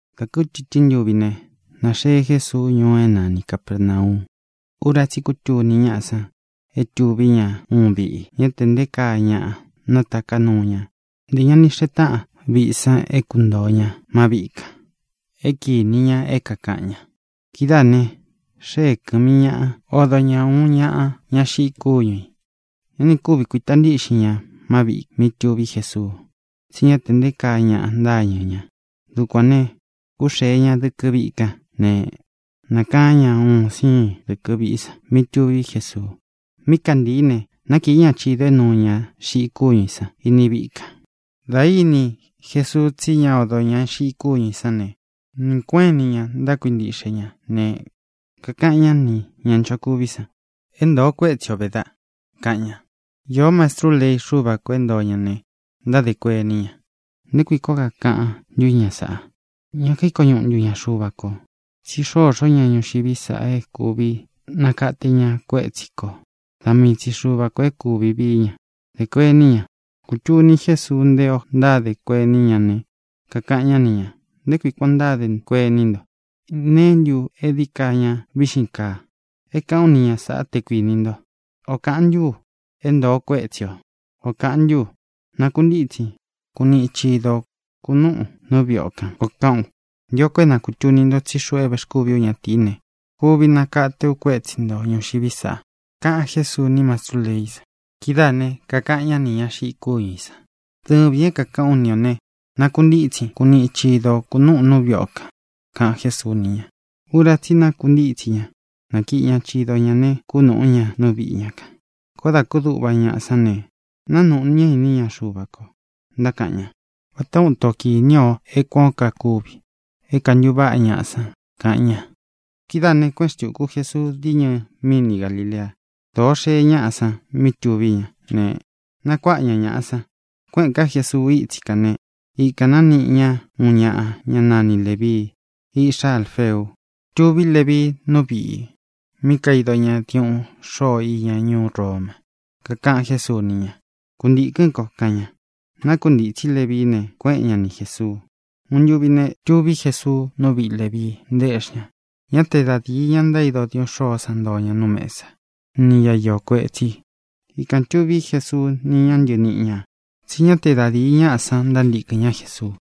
Dā kútɨtɨ́n ntuvi ne, nāxee Jésuu ñuu é nani Capērnau. Ura tsí i kútuni ñáꞌa san é tuví ña uun viꞌi. Ñá tē nté kaa ñaꞌa nátaká nuu ña; ntē ña ni xee táꞌan viꞌi san é kuntōo ña má viꞌi kān é kīni ña é kākaꞌan ña. Kidáā ne, xée kɨ̄mi ñaꞌa, odo ña uun ñaꞌa, ña xiꞌi kúñu ī. Ñá nī kúvi kuīta ntíꞌxin ña má viꞌī mí tuví Jesuu, tsí ña te nté kaa ñaꞌa ntáñɨ̄ ña. Dukuān ne, kúxēe ña dɨkɨ viꞌi kan né, nākaán ña un siin dɨkɨ̄ viꞌí san mí tuví Jesuu. Mí kantīí ne, nákīí ña chidō é nuu ña xiꞌi kúñu ī san iní viꞌi kān. Dā íni Jesuu tsí ña odō ña xiꞌi kúñu ī sán ne, nɨɨ̄ kuéꞌen ini ña ntákuintiꞌxe ña ne, kakaꞌan ñá nī ña nchokuví san: —É ntōo kuétsi o vē, daꞌ —kaꞌan ña. Īó mastrú lei Xúva kō é ntoo ña ne, ntádē kuení ña: “¿Nté kui kuān ó kakaꞌan ntú ña sāꞌa? ¿Ña kaíko ñuꞌu ntu ña Xuva kō? Tsí xoxó ñaꞌa ñuxiví sa é kūvi nakate ña kuétsi kō. Da mii tsi Xuva kō é kūvi vií ña”, dé kuení ña. Kūtuni Jésuu nté ō ntádē kuení ña ne, kakaꞌan ñá ni ñā: —¿Nté kui kuān ó ntádē kuení nto? ¿Neé ntu e dií ka ña víꞌxin kaa é kāꞌán u ni ña sāꞌá, te kuinī nto? ¿Ō kaꞌán ntu u: “É ntōo kuétsi o”, ō kaꞌán ntu u: “Nakuntítsin, kuniꞌin chido ō, kunúꞌūn nú viꞌi o kān”, koo kaꞌán u? Ntio ko é na kūtuni nto tsí xuꞌu é vēxkúvi ú ñatīí ne, kuvi nakate u kuétsi ntō ñuxiví sa —kaꞌan Jésuu ni mastrú leí san. Kidáā ne, kakaꞌan ñá nī ña xiꞌi kúñu ī san: —Dɨvīn é kākaꞌán u ni ō ne, nakuntítsin, kuniꞌin chido ō, kunúꞌūn nú viꞌi o kān —kaꞌan Jésuu ni ña. Ura tsí i nakuntítsi ña, nákiꞌi ña chido ñā ne, kúnūꞌú ña nú viꞌi ña kān. Koó dā kúduꞌva ñaꞌa san ne, nánūꞌu ñá iní ña Xuva kō, ntákaꞌan ña: —Váta ūun ito kini o é kuān ó kakuvi, é kāntuváꞌa ñaꞌa san —kaꞌan ña. Kidáā ne, kuéꞌen xtūku Jesuu diñɨ míni Galilea. Dōo xee ñáꞌa san mí tuví ña ne, nakuáꞌa ña ñaꞌa san. Kuéꞌēn ká Jesuu ítsi kān né, ikān nániꞌi ña uun ñaꞌa, ñá nani Lēvii, iꞌxá Alfeu. Tuví Levii nú viꞌī mí kaido ña diuꞌun xôo iña ñuú Roma. Kakaꞌan Jésuu ni ña: —Kuntīkɨ́n ko —kaꞌan ña. Nákuntītsí Levií ne, kuéꞌen ña ni Jēsuu. Uun ntuvi ne, tuví Jesuu nú viꞌi Lēvii, ntaéꞌxi ña. Ñá te da dīi ña ntaído diuꞌun xôó san ntoo ña nú mesa, ni ñá iō kuetsí i. Ikān tuví Jesuu ni ña ntɨníꞌi ñā. Tsí ña te da díi ñaꞌa san ntántīkɨn ñá Jesuu.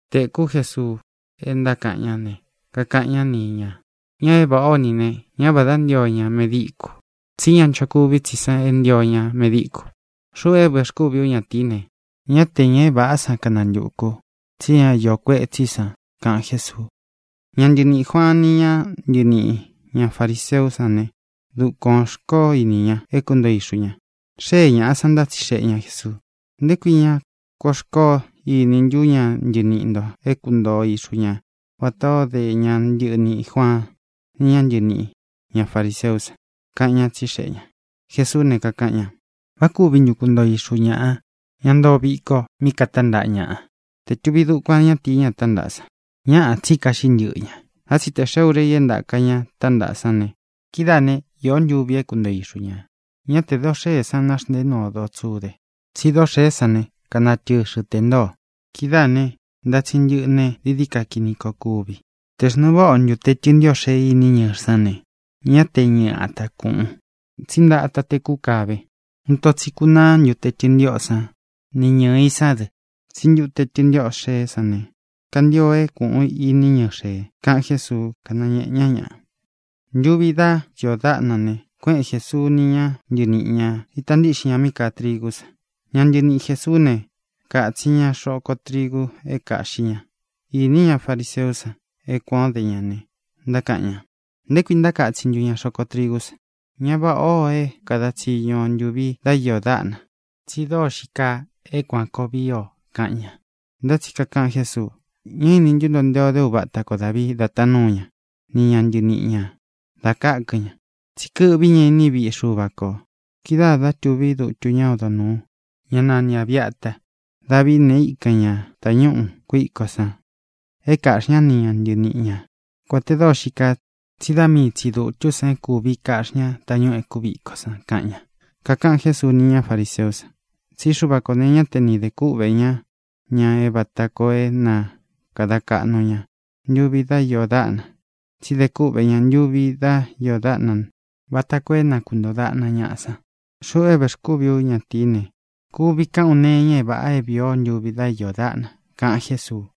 Tēkú Jesuu é ntákaꞌan ñá ne, kakaꞌan ñá ni ñā: —Ñaꞌa é vāꞌá o ni ī ne, ñá vādá ntio ña medíkū; tsí ña nchokuví tsi san é ntio ña medíkū. Xuꞌu é vēxkúvi ú ñatīí ne, ñá tē ña é vāꞌá san kanantukū u, tsí ñá iō kuetsí i san —kaꞌan Jésuu. Ña ntɨniꞌī Juaan ni ñá ntɨniꞌī ña fariseú san ne, dukuān xkoó ini ña é kuntoo ixu ñā. Xée ñāꞌa san, ntátsixeꞌe ña Jēsuu: —¿Nté kui ña kuan xkoó ini ntú ña ntɨniꞌi ntō é kuntoo ixu ña vatā ó de ña ntɨniꞌī Juaan ni ñá ntɨniꞌī ña fariseú san? —kaꞌan ñá, tsixeꞌe ñā. Jesuú ne, kakaꞌan ña: —¿Vá kuvi ntu kuntoo ixu ñāꞌa, ña ntóo viko mí katántaꞌa ñaꞌa, te tuví dukuan ñatīí, ña tántaꞌa san? Ñáꞌā, tsí kaꞌxí ntɨꞌɨ ña. Ntá tsi tē xee úra i é ntaka ña tántaꞌa sán ne, kidáā né, īó ntuvi é kuntoo ixu ñā. ʼÑá tē doo xée san naxntēé nuu o doo tsude, tsí doo xée sán ne, kanatɨxɨ tē ntóo. Kidáā ne, ntátsin ntɨꞌɨ ne, dií dií ka kini koo kuvi. Tē xnuu váꞌa o ntute tɨntiꞌo xee iní ñɨɨ̄ sán ne, ñá te ñɨɨ ata kūꞌun, tsí ntata té kukāve. Uun ito tsi kunaá ntute tɨntiꞌo san ni ñɨɨ ī sán dɨ. Tsí ntute tɨntiꞌo xeé san ne, kantio é kūꞌun iní ñɨɨ xēe —kaꞌan Jésuu, kánañēꞌe ñá ña. Ntuvi dá iō dáꞌna ne, kuéꞌen Jēsuu ni ña ntɨníꞌi ñā, ítā ntiꞌxin ña mí kaa trigú san. Ña ntɨniꞌi Jēsuú ne, kātsin ña xoko trigu é kāꞌxí ña. Īní ña fariseú san é kuān ó de ña ne, ntákaꞌan ña: —¿Nté kui ntákatsin ntu ña xoko trigú san? Ñá vāꞌá ō é kada tsiñu o ntūvi dá iō dáꞌna, tsi dóo xii kaa é kuān koo vii o —kaꞌan ña. Ntá tsi kakaꞌan Jésuu: —¿Ña íni ntú nto nté ō dé uvata ko Dāvii da taan núu ña ni ña ntɨniꞌi ñā da kákɨn ña? Tsí kɨꞌví ña iní viꞌi Xuva kō kidáā dá tuví dutu ñá odo nūu, ñá nani Abīata. Davií ne, íkan ña tāñúꞌu kuíko san é kāꞌxi ñá ni ña ntɨniꞌi ña, kuān te dóo xií kaa, tsí da mii tsī dutú san é kūvi kaꞌxí ña tañúꞌū e kúviko san —kaꞌan ña. Kakaꞌan Jésuu ni ñá fariseú san: —Tsí Xuva kō ne, ñá te nī de kúꞌvē ñá ñaꞌa vata koo é na kāda kaꞌnu ña ntuvi dá iō dáꞌna, tsí dē kúꞌvē ñá ntuvi dá iō dáꞌna vata koo é na kūntoo daꞌna ñaꞌa san. Xuꞌu é vēxkúvi ú ñatīí ne, kuvi kāꞌán u nee iña é vāꞌa é vīi o ntúvi dá iō dáꞌna —kaꞌan Jésuu.